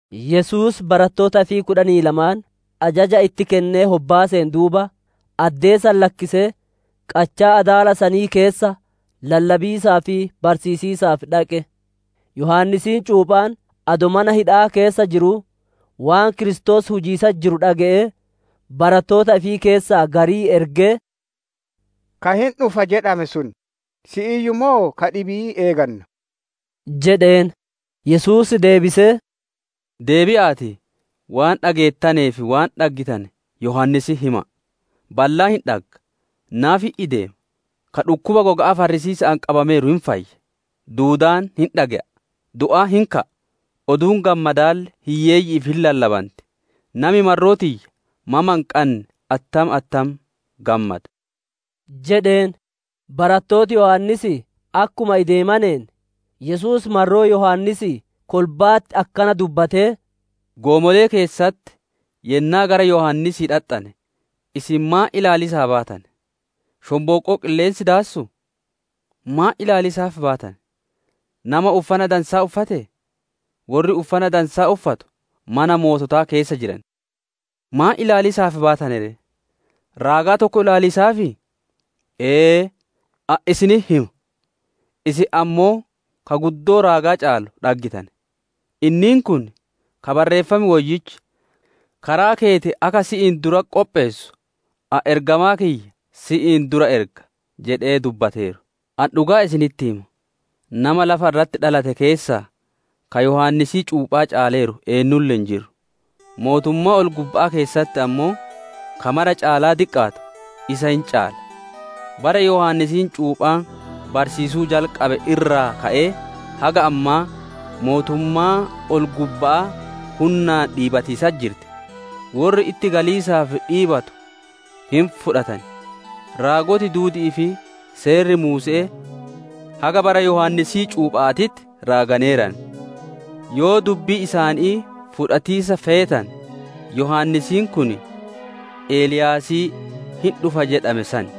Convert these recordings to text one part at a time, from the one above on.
Yesuus barattoota ifii kudhanii lamaan ajaja itti kennee hobbaaseen duuba, addee san lakkisee qachaa adaala sanii keessa lallabiisaa fi barsiisiisaaf dhaqe. Yohaannisiin cuuphaan adoo mana hidha'aa keessa jiruu, waan Kiristoos hujiisatti jiru dhage'ee, barattoota ifii keessaa garii ergee, «Ka hin dhufa jedhame sun si'iiyyu moo ka dhibii eeganna?» jedheen. Yesuus deebisee, «Deebi'a'aatii waan dhageettanee fi waan dhaggitane Yohaannisitti hima'a: Ballaan hin dhagga, naafi hin ideema, ka dhukkuba goga'aa farrisiisa'aan qabameeru hin fayya, duudaan hin dhage'a, du'aan hin ka'a, Oduun Gammadaalle hiyyeeyyi'iif hin lallabanti. Nami marroo tiyya mama hin qabaanne attam attam gammada» jedheen. Barattooti Yohaannisii akkuma ideemaneen, Yesuus marroo Yohaannisii kolba'atti akkana dubbatee, «Goomolee keessatti yennaa gara Yohaannisii dhaxxane, isin maan ilaaliisaaf baatane? Shonbooqqoo qilleensi daassuu? Maan ilaaliisaaf baatane? Nama uffana dansaa uffatee? Worri uffana dadansaa uffatu mana moototaa keessa jiran! Maan ilaaliisaaf baatane ree? Raagaa tokko ilaaliisaafii? Ee, ani isinitti hima, isin ammoo ka guddoo raagaa caalu dhaggitane. Inniin kun, ka Barreeffam Woyyichi, «‹Karaa keeti akka si'iin duratti qopheessu, ani ergamaa kiyya si'iin dura erga› jedhee dubbateeru. «Ani dhugaa isinitti hima, nama lafa irratti dhalate keessaa, ka Yohaannisii cuuphaa caaleeru eennulle hin jiru; Mootummaa ol-gubba'aa keessatti ammoo, ka mara caalaa diqqaatu isa hin caala. Bara Yohaannisiin cuuphaan barsiisuu jalqabe irraa ka'ee haga ammaa mootummaan ol-gubba'aa hunnaan dhiibatiisatti jirti; worri itti galiisaaf dhiibatu hin fudhatan. Raagoti duudi'ii fi seerri Muuse'ee haga bara Yohaannisii cuupha'aatitti raaganeeran. Yoo dubbii isaanii fudhatiisa feetane, Yohaannisiin kun, Eliyaasii hin dhufa jedhame san.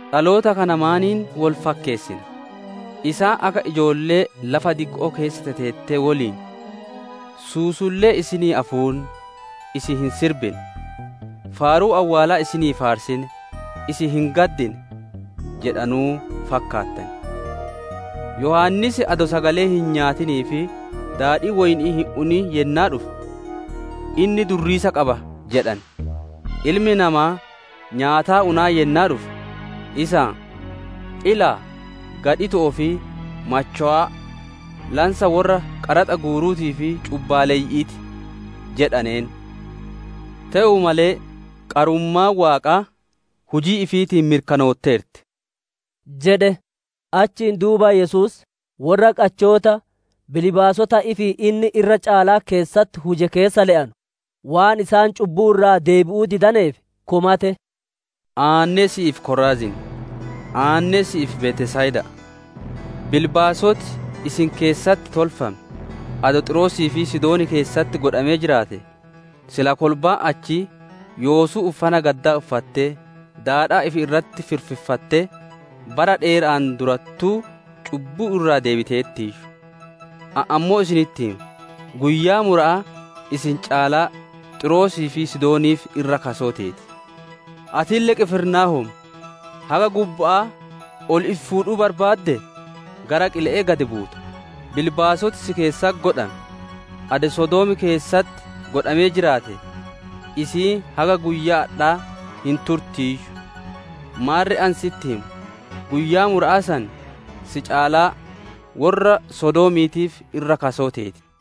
«Dhaloota kana maaniin wol fakkeessina? Isaan akka ijoollee lafa dikko'oo keessa teteettee woliin, ‹Suusullee isinii afuunne, isin hin sirbine; faaruu awwaalaa isinii faarsine, isin hin gaddine› jedhanu fakkaattan. Yohaannis adoo sagalee hin nyaatinii fi daadhii woyni'ii hin unin yennaa dhufe, ‹Inni durriisa qaba› jedhane. Ilmi Namaa nyaataa unaa yennaa dhufe, isaan ‹Ilaa, gadhito'oo fi machowaa, lansa worra qaraxa guuruutii fi cubbaaleyyi'ii ti› jedhaneen. Te'uu malee, qarummaan Waaqaa, hujii ifiitiin mirkanootteerti» jedhe. Achiin duuba Yesuus worra qachoota bilbaasota ifii inni irra caalaa keessatti huje keessa le'anu, waan isaan cubbuu irraa deebi'uu didaneef komate. «Aanne'e si'iif, Koraaziin! Aanne'e si'iif, Betsayida'a! Bilbaasoti isin keessatti tolfame, adoo Xiiroosii fi Sidoon keessatti godhamee jiraatee, silaa kolbaan achii yoosuu uffana gaddaa uffattee, daadhaa ifi irratti firfiffattee bara dheera'aan durattuu cubbuu irraa deebiteertiiyyu. Ani ammoo isinitti hima, guyyaa mura'aa isin caalaa Xiiroosii fi Sidooniif irra kasoo teeti. Atille Qifirnaahoom, haga gubba'aa ol ifi fuudhuu barbaaddee? Gara qile'ee gad buuta. Bilbaasoti si keessatti godhame, adoo Sodoom keessatti godhamee jiraatee, isiin haga guyyaa adhaa hin turtiiyyu. Maarre ani sitti hima, guyyaa mura'aa san si caalaa worra Sodoomiitiif irra kasoo teeti» jedhe.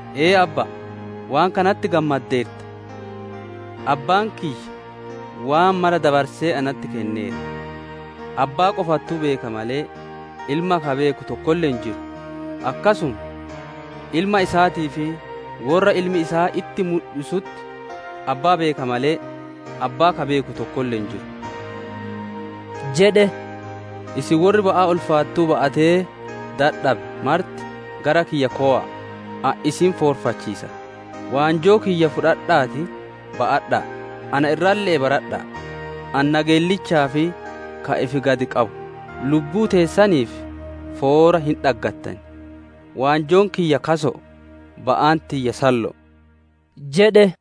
Ee, Abba'a, waan kanatti gammaddeerta. Abbaan kiyya waan mara dabarse natti kenneera; Abbaa qofattuu beeka malee, Ilma ka beeku tokkolle hin jiru, akkasuma Ilma isaatii fi worra Ilmi isaa itti mudhisutti Abbaa beeka malee, Abbaa ka beeku tokkolle hin jiru» jedhe. «Isin worri ba'aa ulfaattuu ba'atee dadhabe marti, gara kiyya kowa'a, ani isin foorfachiisa. Waanjoo kiyya fuudha'aatii ba'adha'a, ana irralle'ee baradha'a; ani nageellichaa fi ka ifi gad qabu; lubbuu teessaniif foora hin dhaggattan. Waanjoon kiyya kaso'o, ba'aan tiyya sallo'o» jedhe.